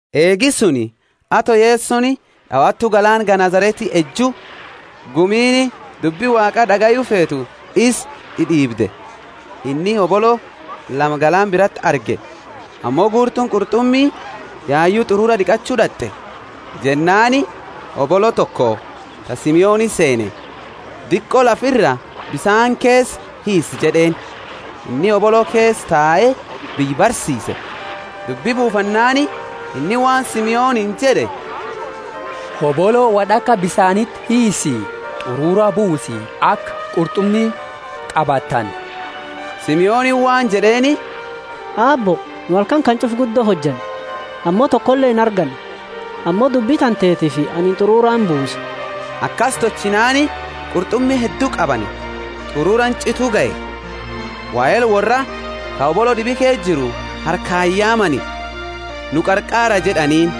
Eegi suni, ato Yesoni d'awatu galaana Genesareti eju, gumiini dubbi Waaqa d'agayu feetu isa d'id'iibde. Inni hobolo lama galaana birati arge; ammo guurtuuni qurt'umi yayu t'urura d'iqachu d'at'e. Jennaani hobolo toko ta Simoni seene, Diqo lafa ira bisaani keesa hiisi jed'eeni. Inni hobolo keesa tae biyya barsiise. Dubbi buufannaani inni waan Simoniini jed'e, Hobolo wod'aka bisaaniti hiisi, t'urura buusi aka qurt'umi qabatani. Simoniini waan jed'eeni, Aabbo, nu halkani kana ch'ufa guddo hojanne, ammo tokole inarganne, ammo dubbi tantetiifi anini t'urura imbuusa. Akasi tolchinaani qurt'umi heddu qabani, t'ururaani ch'itu gahe. Wahela worraa ka hobolo d'ibi keesa jiru harkaani yaamani, Nu qarqaara jed'aniini.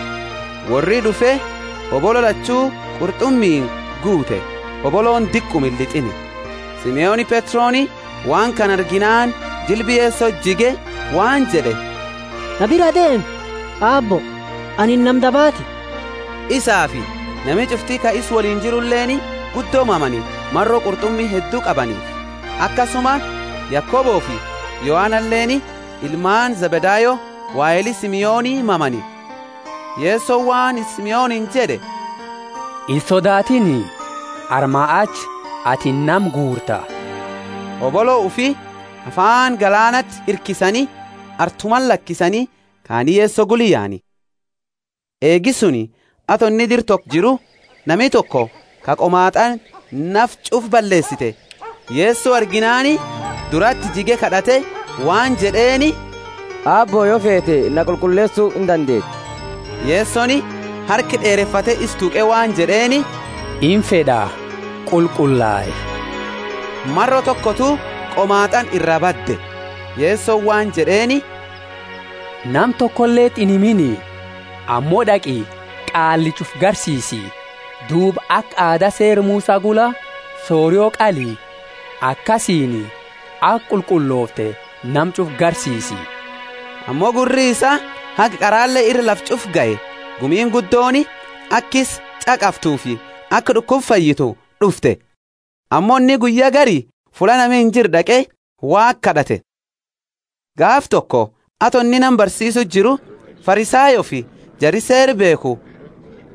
Worri d'ufe hobolo lachu qurt'umiini guute hobolooni diquma illit'iini. Simoni Petroni waan kana arginaani jilba Yesoti jige waan jed'e, Na biraa deemi, Aabbo, anini nama dabaati. Isaafi nami ch'ufti ka isa woliini jiruleeni guddo mamani, maro qurt'umi heddu qabaniifi. Akasuma Yakobofi Yohanaleeni, ilmaani Zebedayo, waheli Simoni mamani. Yesoni waan Simoniini jed'e, Insodaatini, armaa achi atini nama guurta. Hobolo ufi afaani galaanati hirkisani artumati lakisani kaani Yeso gula yaani. Eegi suni, ato inni dira toko jiru, nami toko, ka qomaat'aani nafa ch'ufa balleesite, Yeso arginaani durati jige kad'ate waan jed'eeni, Aabbo, yo feete, na qulqulleesu indandeeta. Yesoni harka d'eerefate isa tuqe waan jed'eeni, Imfed'a, qulqullai. Maro tokotu qomaat'aani iraa badde. Yesoni waan jed'eeni, nama tokoleti inhimini, ammo d'aqi qaallicha ufi garsiisi, duuba aka aada Seera Musa gula sorio qali akasiini aka qulqullofte nama ch'ufa garsiisi. Ammo gurri isaa haga qarale ira lafa ch'ufa gahe; gumiini guddooni aka isa ch'aqaftufi aka d'ukuba fayyitu d'ufte. Ammo inni guyya gari fulla nami injirre d'aqe Waaqa kad'ate. Gaafa toko, ato inni nama barsiisu jiru, Farisayoofi jari Seera beekhu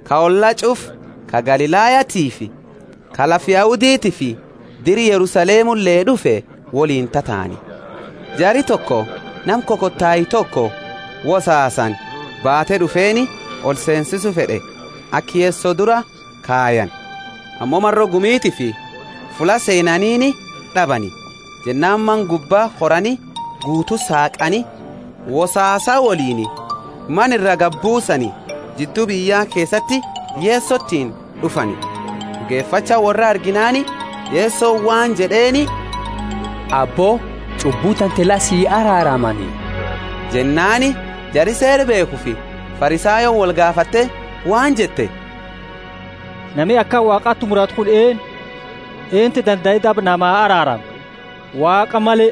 ka olla ch'ufa ka Galilayatiifi ka lafa Yahuditiifi dira Yerusalemule d'ufe woliini tataani. Jari, toko nama kokotae toko wosaasani baate d'ufeeni olseensisu fed'e, aka Yeso dura kayani. Ammo maro gumitiifi fulla seenanini d'abani, jennaani mana gubba korani guutu saaqani wosaasa woliini mana iraa gadi buusani jiddu biyya keesati Yesotiini d'ufani. D'ugefacha worra arginaani Yesoni waan jed'eeni, Abbo, ch'ubbu tante la si araaramani. Jennaani jara Seera beekhufi Farisayooni wolgaafatte waan jette, Nami akana Waaqati muratu kunini eennu? Eentu dandae daba nama araarama, Waaqa male?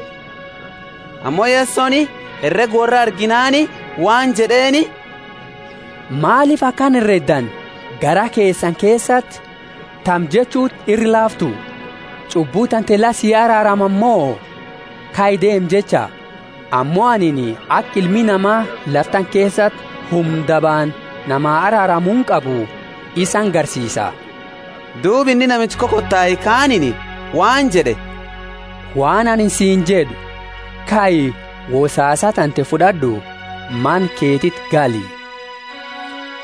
Ammo Yesoni herega worra arginaani waan jed'eeni, Maalifi akana hereddani garaa keesani keesati? Tami jechuti ira laaftu, Ch'ubbu tante la si araaramani mo, Kai deemi jecha? Ammo anini aka Ilmi Nama lafa tana keesati humna dabaani nama araaramuuni qabu isani garsiisa. Duuba inni namicha kokotae kaaniini waan jed'e, Waan anini siini jed'u, kai, wosaasa tante fud'ad'u, mana keetiti gali.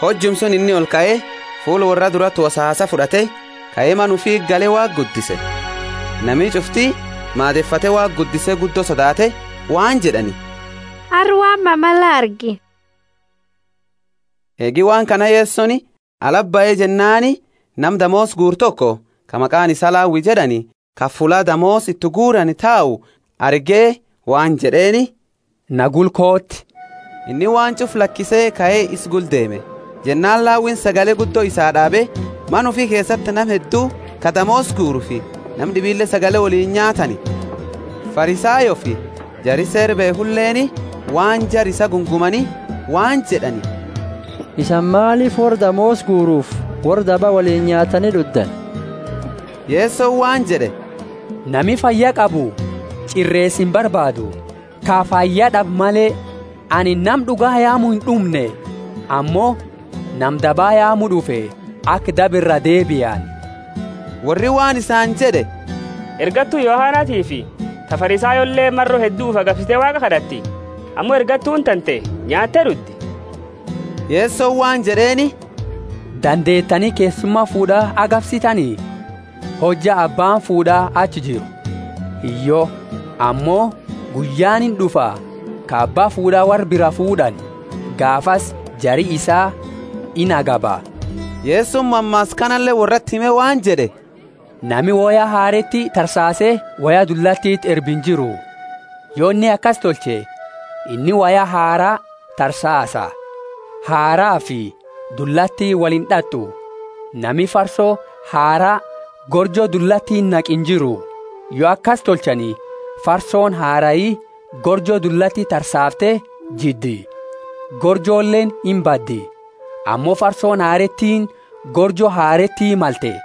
Hojuma suni inni olkae, fuula worra durati wosaasa fud'ate kae mana ufiti gale Waaqa guddise. Nami ch'ufti maadefate Waaqa guddise guddo sodaate, waan jed'ani, Arra waan mama la argine. Eegi waan kana Yesoni alati bahe jennaani nama damoosa guuru toko, ka maqaani isaa Lawi jed'ani, ka fulla damoosa iti guurani tau arge waan jed'eeni, Na gula kooti. Inni waan ch'ufa lakise kae isa gula deeme. Jennaani Lawini sagale guddo isaa d'aabe mana ufi keesati, nama heddu ka damoosa guurufi nama d'ibile sagale woliini nyaatani. Farisayoofi jari Seera beekhuleeni waan jara isaa gungumani waan jed'ani, Isani maalifi worra damoosa guurufi worra daba woliini nyaattani d'uddani? jed'ani. Yesoni waan jed'e, Nami fayya qabu ch'ireesa imbarbaadu, ka fayya d'abe male. Anini nama d'uga yaamu ind'umne, ammo nama daba yaamu d'ufe, aka daba iraa deebiani. Worri waan isaani jed'e, Ergattu Yohanatiifi ta Farisayooleeni maro heddu ufi agabsite Waaqa kad'atti, ammo ergattuuni tante nyaatte d'uddi. Yesoni waan jed'eeni, Dandeetani keessuma fuud'a agabsitani hojja abbaani fuud'a achi jiru? Hiyyo. Ammo guyyaani ind'ufa ka abba fuud'a worra biraa fuud'ani, gaafasi jari isaa inagaba. Yesoni mammaasa kanale worrati hime waan jed'e, Nami woya hareeti tarsaase woya dullatiti erbu injiru. Yo inni akasi tolche, inni woya haraa tarsaasa, haraafi dullatiini woli ind'at'u. Nami farso haraa gorjo dullatiti naqu injiru; yo akasi tolchani farsooni harai gorjo dullati tarsaafte jiddi, gorjoleeni imbaddi. Ammo farsooni hareetiini gorjo hareeti malte.